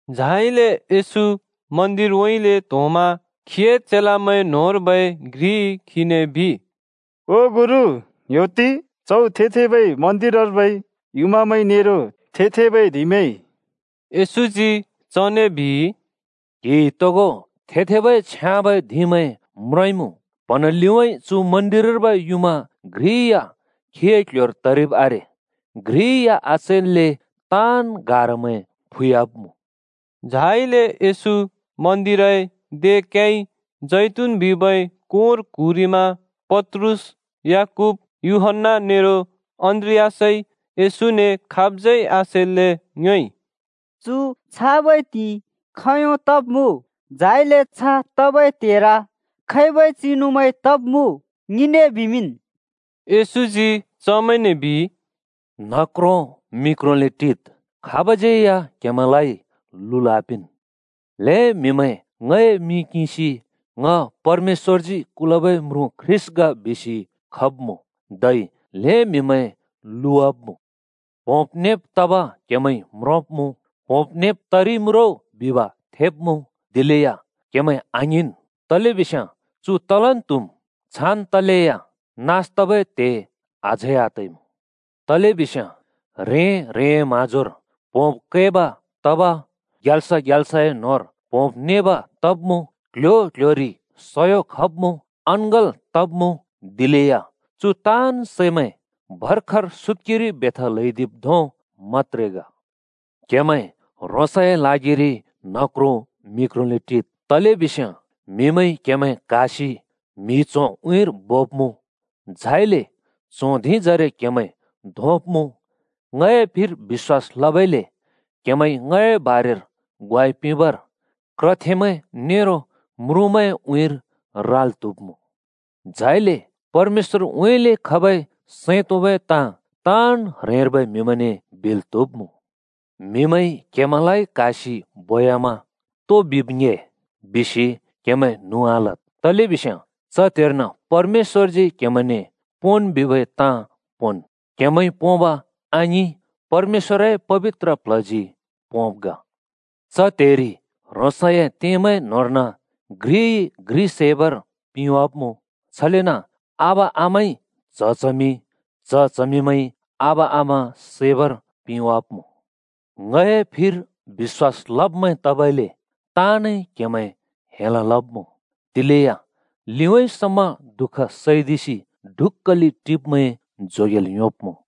झाइले येशू मन्दिरउँइँले त्‍होंमा खीए चेलामैं न्‍होंर्बै घ्रिइ खीने बिइ, “ओ गुरु, ङ्‌ह्‍योत्ति, च्हौ थे-थेबै मन्दिरर्बै युँमामैं नेरो थे-थेबै धिंमैं।” येशूजी चने बिइ, “क्‍हिइ तोगो थे-थेबै छ्याँबै धिंमैं म्रोंइमुँ? प्‍हँना लिउँइँ चु मन्दिरर्बै युँमा घ्रि या खीए क्‍ल्‍ह्‍योर तरिब् आरे, घ्रि या आचैल्‍ले ताँन् गारामैं फुह्‍याब्‍मुँ।” झाइले येशू मन्दिरए दे क्‍याइ जैतून बिबै कोंर क्हुँरिमा पत्रुस, याकूब, यूहन्‍ना नेरो अन्‍द्रियासइ खाबज्यै आसेल्‍ले येशूने ङ्योएइ, “चु छाबै त्हिंइ खोंयों तब्मुँ? झाइले छ तबै त्हेर खैबै चिनुमैं तब्मुँ? ङिने बिमिंन्।” येशूजी चमैंने बिइ, “न्ह क्रों मि क्रोंले टिद्, खाबज्‍यै या क्‍हेमैंलाइ लुल् आपिंन्। ल्‍हें म्‍हिमैं ङए मिं किंसि, ‘ङ परमेश्‍वरजी कुलबै म्रुँ (ख्रीष्‍ट) ग,’ बिसि खब्‍मुँ, धै ल्‍हें म्‍हिमैं लुवाब्‍मुँ। प्होंब् नेब् तब क्हेमैंइ म्रोंब्मुँ, ‘प्होंब् नेब् तरिइमुँ रो’ बिब थेब्‍मुँ, दिलेया क्हेमैं आङ्हिंन् तलेबिस्याँ चु तलन् त्हुम्। छान् तलेया नास तबै त्हे अझै आतइमुँ। तलेबिस्याँ ह्रें-ह्रेंए म्‍हाँजोर प्होंब् कैब् तब, ग्याल्स ग्याल्सए न्होंर प्होंब् नेब् तब्‍मुँ क्‍ल्‍ह्‍यो क्‍ल्‍ह्‍योरि सयो ख‍ब्मुँ, अँङ्गल् तब्‍मुँ। दिलेया चु ताँन् सैमैं भर्खर सुत्‍केरि बेथा ल्हैदिब् धों मत्‍त्रे ग। “क्‍हेमैं ह्रोंसए ल्हागिरि न्ह क्रों मिक्रोंले टिद्। तलेबिस्याँ म्‍हिमैंइ क्‍हेमैं क्‍हासि म्हि च्होंए उँइँर बोब्‍मुँ, झाइले च्हों धिंजरे क्‍हेमैं धोंब्‍मुँ। ङए फिर बिश्‍वास लबइले क्हेंमैंइ ङए बारेर ग्वाइ पिंबर क्रथेमैं नेरो म्रुँमैंए उँइँर राल् त्हुब्मुँ। झाइले परमेश्‍वरउँइँले खबै सैं तोंबै ताँ ताँन् ह्रेंर्बै म्हिमैंने बिल् त्हुब्मुँ। म्हिमैंइ क्‍हेमैंलाइ क्‍हासि बोयामा ‘तो बिब् ड्हे,’ बिसि क्‍हेमैं न्हुँ आलद्। तलेबिस्याँ च त्हेर्न परमेश्‍वरजी क्हेमैंने ‘पोंन्’ बिबै ताँ पोंन्। क्‍हेमैंइ पोंब आङिं, परमेश्‍वरए पबित्र प्ल्हजी पोंब् ग। “च त्हेरि ह्रोंसए त्येमैं न्होंर्न घ्रिइ घ्रि सैबर पिंवाब्‍मुँ, छलेन आबा आमाइ च्‍ह च्हमि, च्‍ह चमिंमैंइ आबा आमा सैबर पिंवाब्‍मुँ। ङए फिर बिश्‍वास लब्मैं तबइले ताँनइ क्‍हेमैं हेल् लब्‍मुँ। दिलेया लिउँइँ समा दुःख सैदिसि ढुक्‍कले टिब्मैं जोगेल् योंब्‍मुँ।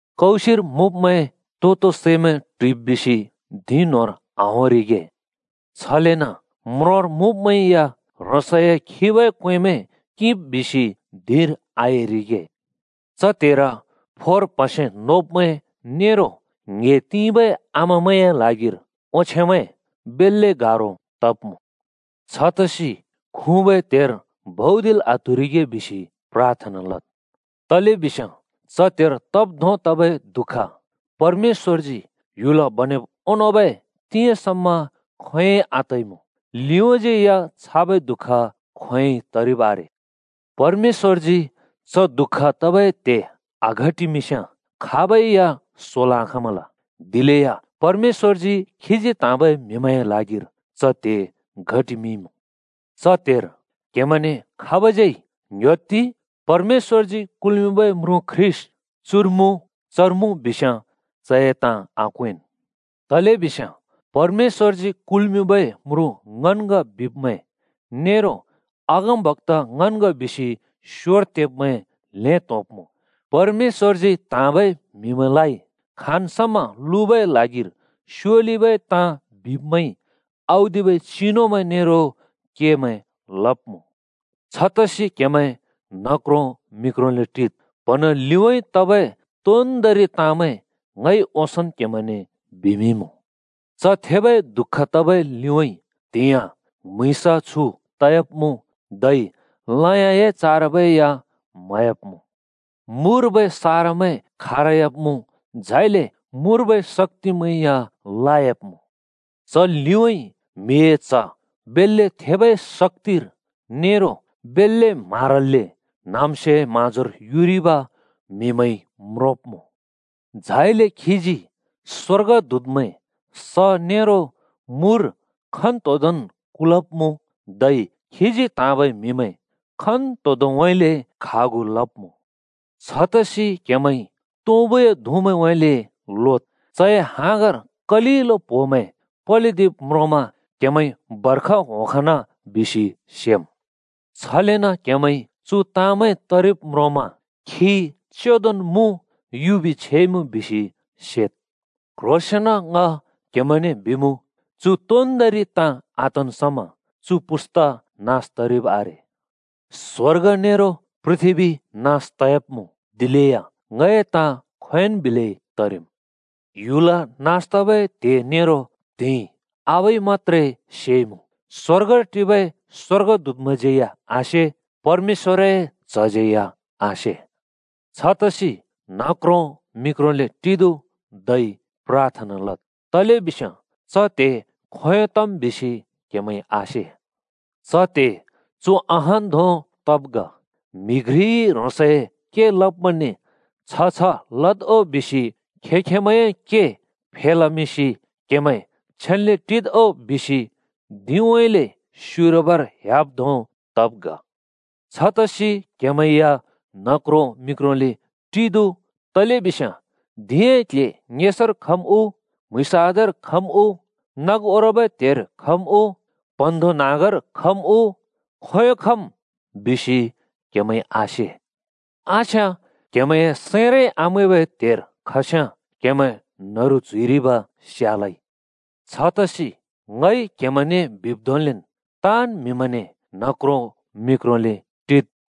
कौसिर मुँब्‍मैं तो-तो सैमैं ट्हुइब् बिसि धिं न्होंर आहोंरिगे। छलेन म्रोंर मुँब्‍मैं या ह्रोंसए खिबै क्‍वेंमैं किंब् बिसि धिंर आएरिगे। च त्हेर फोर प्‍हसे नोब्‍मैं नेरो ङ्हे तिंबै आमामैंए ल्हागिर ओंछेमैं बेल्‍ले गारो तब्‍मुँ। छतसि खुँबै त्हेर भौदिल् आत्हुरिगे बिसि प्राथना लद्। तलेबिस्याँ च त्हेर तब् धों तबै दुःख परमेश्‍वरजी ह्‍युल केमिंब् ओंनोंबै तिंयाँ समा खोंयोंइ आतइमुँ, लिउँज्यै या छाबै दुःख खोंयोंइ तरिब् आरे। परमेश्‍वरजी च दुःख तबै त्हे आघटिमिंस्‍याँ खाबै या सोल् आखाँमल। दिलेया परमेश्‍वरजी खीजी त्‍हाँबै म्‍हिमैंए ल्हागिर च त्हे घटिमिंइ‍मुँ। “च त्हेर क्‍हेमैंने खाबज्यै ‘ङ्‍ह्‍योत्ति! परमेश्‍वरजी कुल्मिंबै म्रुँ ख्रीष्‍ट चुर मुँ, चर मुँ’ बिस्याँ चए ताँ आक्वेंन्। तलेबिस्याँ ‘परमेश्‍वरजी कुल्‍मिंबै म्रुँ ङन् ग’ बिब्‍मैं नेरो ‘अगमबक्‍ता ङन् ग’ बिसि स्‍योर तेब्मैं ल्‍हें त्‍होंब्‍मुँ। परमेश्‍वरजी त्‍हाँबै म्‍हिमैंलाइ खाँन् समा लुबै ल्हागिर स्योलिबै ताँ बिब्मैंइ औदिबै चिनुमैं नेरो केमैं लब्‍मुँ। छतसि क्‍हेमैं न्हक्रों मिक्रोंले टिद्। प्‍हँना लिउँइँ तबै तोन्दोंरि ताँमैं ङइ ओंसोंन् क्‍हेमैंने बिमिंइमुँ। “च थेबै दुःख तबै लिउँइँ त्‍हिंयाँ म्‍हुँइँस छु तयाब्मुँ, धै लयाँए चारबै या म्हह्‍याब्मुँ। मुर्बै सारमैं खारह्‍याब्‍मुँ, झाइले मुर्बै शक्‍तिमैं या लायाब्‍मुँ। च लिउँइँ म्हिए च्ह बेल्‍ले थेबै शक्‍तिर नेरो बेल्‍ले म्हारल्‍ले न्हाँम्स्योए म्हाँजोर युरिब म्‍हिमैंइ म्रोंब्मुँ। झाइले खीजी स्वर्गदूतमैं स नेरो मुर खन्तोदोंन् कुलब्मुँ, धै खीजी त्‍हाँबै म्‍हिमैं खन्तोदोंनउँइँले खागु लब्मुँ। “छतसि क्‍हेमैंइ तुँबुए धुँमैंउँइँले लोद्। चए हाँगर कलिलो प्‍होमैं पलिदिब् म्रोंमा क्‍हेमैंइ बर्ष होंखन बिसि सेम्। छलेन क्‍हेमैंइ चु ताँमैं तरिब् म्रोंमा खी चेंदोन् मुँ, युबि छेइमुँ बिसि सेद्। क्ह्रोंसेंन ङ क्हेमैंने बिमुँ, चु तोन्दोंरि ताँ आतन् समा चु पुस्ता नास तरिब् आरे। स्‍वर्ग नेरो पृथ्‍बी नास तयाब्‍मुँ, दिलेया ङए ताँ खोंयोंन् बिलै तरिम्। “ह्‍‍युल नास तबै त्हे नेरो त्हिंइ आबाइ मत्‍त्रे सेइमुँ। स्‍वर्गर टिबै स्‍वर्गदूतमैंज्यै आसे, परमेश्‍वरए च्‍हज्यै या आसे। छतसि न्हक्रों मिक्रोंले टिदु धै प्राथना लद्, तलेबिस्याँ च त्हे खोंयों तम् बिसि क्‍हेमैंइ आसे। च त्हे चु अहान् धों तब् ग। म्‍हि घ्रिइ ह्रोंसए के लब्मैंने छ छ लद् ओ बिसि खें-खेंमैंए के फेलमिंसि ‘क्‍हेमैं छेन्‍ले टिद् ओ’ बिसि धिंउँइँले स्‍युरबर ह्‍याब् धों तब् ग। छतसि क्हेमैं या न्हक्रों मिक्रोंले टिदु तलेबिस्याँ धिंए क्ल्हे ङेसर खम् उ, म्हुँइँस आधार खम् उ, नग ओरबै त्हेर खम् उ, प्‍हँन्हाँग्धों न्‍हाँगर खम् उ, खोंयों खम्? बिसि क्‍हेमैंइ आसे। आस्याँ क्हेमैंए सैंरै आमैंबै त्हेर खस्याँ क्‍हेमैं न्‍हरु च्‍हुइरिब स्‍यालै। छतसि ङइ क्‍हेमैंने बिब् धोंलेन्, ताँन् म्हिमैंने ‘न्हक्रों मिक्रोंले टिद्!’ बिमुँ।”